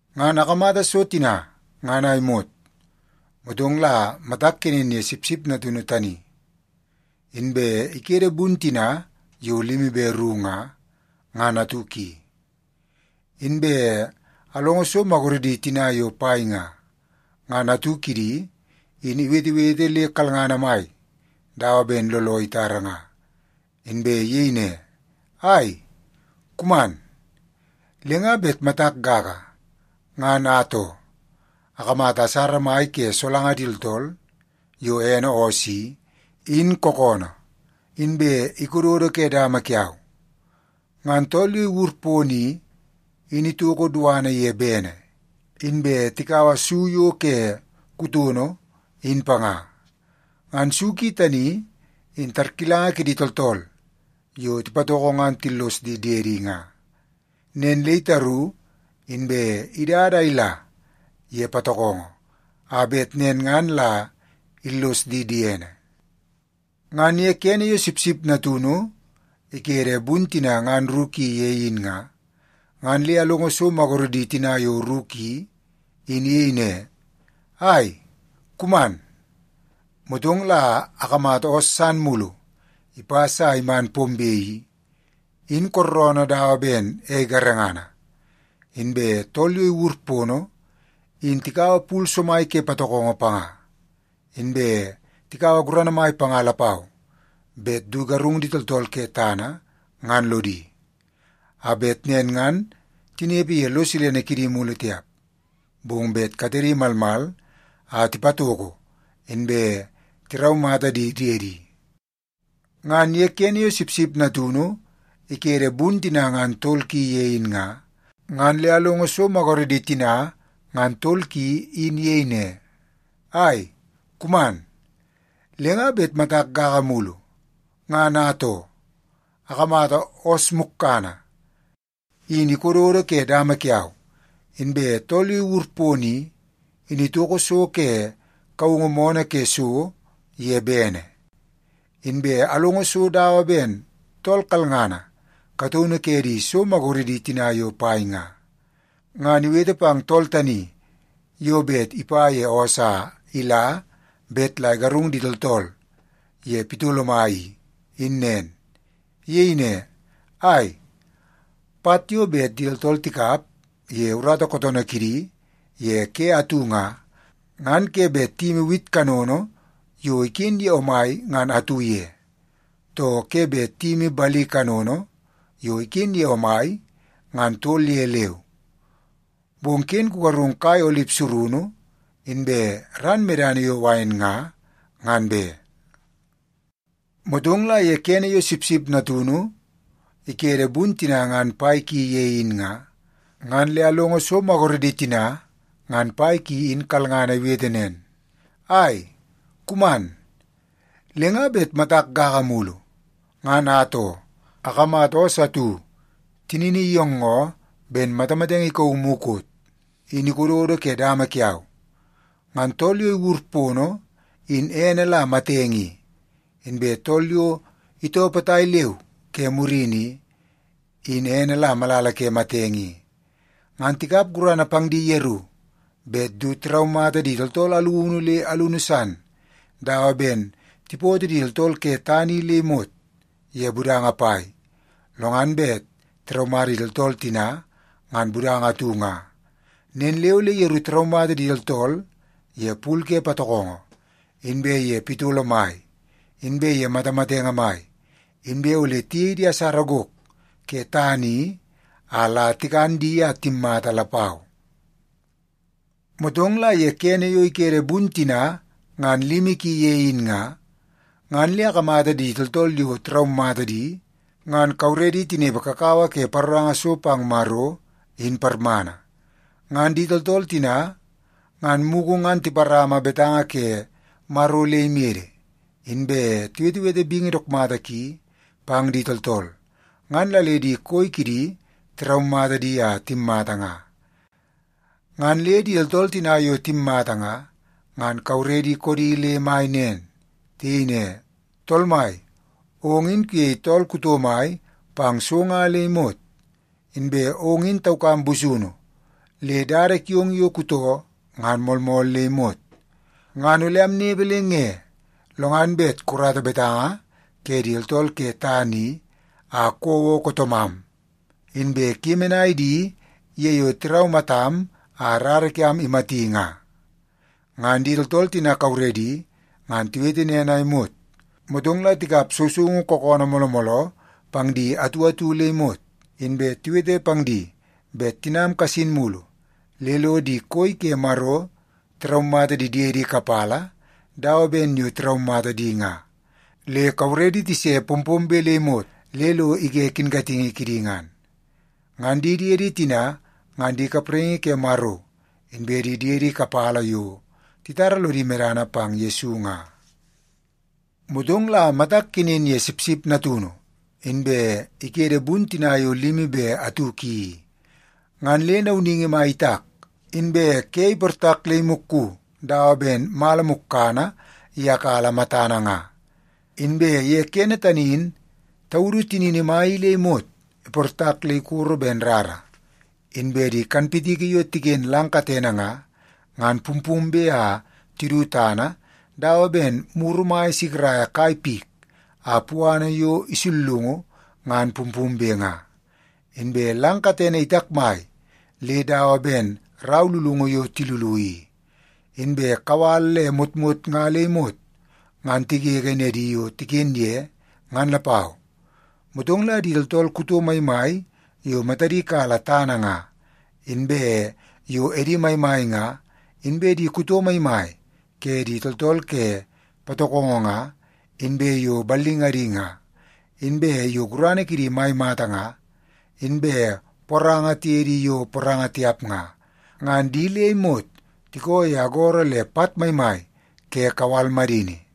Ngan akamata so tina ngan a imot, motong la matak kenen ye Sipsip Natunu tani, inbe ikede bun tina yo limi be ru nga, ngan atu ki. Inbe alongo so maguredi tina yo pai nga, ngan atu kidi in iwetewete le kalngana mai dawa ben looloo itara nga, inbe iyei ne, “Ai, kuman!” Le nga bet matak gaga, ngan atoo, akamata asara mai ke solanga di tooltool yo ene oos i, in kookoonoo, inbe ikododo ke dama kiau. Ngan tool yo iwur pono i, in itoko duana ye bene, inbe tikaua su yo ke kutono in panga. Ngan su ki tani in tarkilanga kidi tooltool yo tipatoko ngan tillos di diedi nga. Nen le itaru inbe idada a ila ye patokongo a bet nen ngan la illos di diene. Ngan ye kene yo Sipsip Natunu ikede bun tina ngan ru ki ye in nga, ngan le alongo so maguredi tina ngan ru ki in iyei ne, “Ai, kuman!” Motong la akamata oos san mulu ipas a iman pombe i, in kooroonoo dawa ben ei garengana. Inbe tool yo iwur pono in tikaua pul somai ke patokongo panga, inbe tikaua gurana mai panga lapau bet du igarung di tooltool ke tana ngan lodi, a bet nen ngan tinepe ye lo silene kidi mulu tiap, bong bet katedi malmal a tipatoko inbe tiraumata di diedi. Ngan ye kene yo Sipsip Natunu ikede bun tina ngan tol ki ye in nga, ngan le alongo so maguredi tina ngan tol ki in iyei ne, “Ai, kuman!” Le nga bet matak gaga mulu, ngan atoo, akamata oos mukkana in ikododo ke dama kiau, inbe tool yo iwur pono i, in itoko so ke kaungu moonoo ke so ye bene. Inbe alongo so dawa ben tool kalngana kataunu ke di so maguredi tina yo pai nga, ngan iwete pang tool tani yo bet ipa ye oos a ila bet la igarung di tooltool ye pitolo mai i, in nen. Iyei ne, “Ai, pat yo bet di tooltool tikap ye urata kootoonoo kidi ye ke atu nga, ngan ke bet tiyimi wit kanono yo iken ye omai ngan atu ye, too ke bet tiyimi bali kanono yo iken ye omai ngan tol ye leu. Bong ken kugarung kai olip surunu inbe ran medana yo wain nga, ngan be!” Motong la ye kene yo Sipsip Natunu ikede bun tina ngan pai ki ye in nga, ngan le alongo so maguredi tina ngan pai ki in kalngana iwete nen, “Ai, kuman!” Le nga bet matak gaga mulu, ngan atoo, akamata oos atu tinini iyoongoo ben matamatenge ikauu mukot, in ikododo ke dama kiau. Ngan tool yo iwur pono in ene la Matenge i, inbe tool yo itoo potai leu ke murini i, in ene la Malala ke Matenge i. Ngan tikap gurana pang di yeru bet du tiraumata di tooltool alunu le alunu san dawa ben tipoto di tooltool ke tana i le imot ye budanga pai, lo ngan bet tiraumata di tooltool tina ngan budanga atu nga. Nen le ole yeru tiraumata di tooltool ye pul ke patokongo, inbe ye pitolo mai, inbe ye matamatenge mai, inbe ole tiyei di asara gok ke tana i a la tikan di a timmata lapau. Motong la ye kene yo ikede bun tina ngan limi ki ye in nga, ngan le akamata di tooltool yo tiraumata di ngan kauredi tinepe kakawa ke paroranga so pang Maro in parmana. Ngan di tooltool tina ngan mugu ngan tiparama betanga ke Maro le imede, inbe tiwetewete bingi dook mata ki pang di tooltool, ngan la le di koi kidi tiraumata di a timmata nga. Ngan le di tooltool tina yo timmata nga, ngan kauredi koodi le mai nen. Tiyei ne, “Tool Mai, ong in kuyei tool kuto mai pang so nga le imot. Inbe ong in taukam busunu le dada kiong yo kutoo ngan moolmool le imot. Ngan ole amnepe le nge, lo ngan bet kukarata betanga ke di tooltool ke tana i a kouo kootoomam, inbe kuyemenai di ye yo tiraumatam a rara kiam imati nga?” Ngan di tooltool tina kauredi ngan tiwete nen a imot, motong la tikap sousoungu kookoonoo mooloo mooloo pang di atu atu le imot. Inbe tiwete pang di bet tinam kasin mulu le lo di koi ke Maro tiraumata di diedi kapala dawa ben yo tiraumata di nga, le kauredi tise pompombe le imot le lo ige kinkatingi kidi ngan. Ngan di diedi tina ngan di kapraingi ke Maro inbe di diedi kapala yo titara lodi medana pang Yesu nga. Motong la matak kenen ye Sipsip Natunu, inbe ikede bun tina yo limi be atu ki i, ngan le nauningi mai itak, inbe ke iportak le imukku dawa ben mala mukkana iyakala matana nga. Inbe ye kene tani in taudu tinini mai i le imot iportak le ikoro ben rara, inbe di kanpitiki yo tiken lang katene nga, ngan pumpumbe a tidu tana dawa ben muru mai isikiraia kai pik a puana yo isullungu ngan pumpumbe nga. Inbe lang katene itakmai le dawa ben rau lulungu yo tilulu i, inbe kawal le motmot nga le imot ngan tigege nedi yo tiken ye, ngan lapau. Motong la di tooltool kuto maimai yo matadi kala tana nga, inbe yo edi maimai nga, inbe di kuto maimai ke di tooltool ke patokongo nga, inbe yo ballingadi nga, inbe yo gurana kidi mai mata nga, inbe poranga tiye di yo poranga tiap nga, ngan di le imot tiko ye agoro le pat maimai ke kawal madini.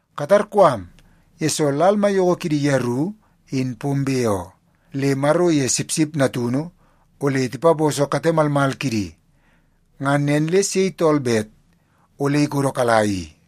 Katarkoo am, yesoo lal maiyoko kidi yeru in pombe oo, le Maro iye Sipsip Natunu ole tipaposo kate malmal kidi. Ngan nen le sei tool bet ole ikodokala i?”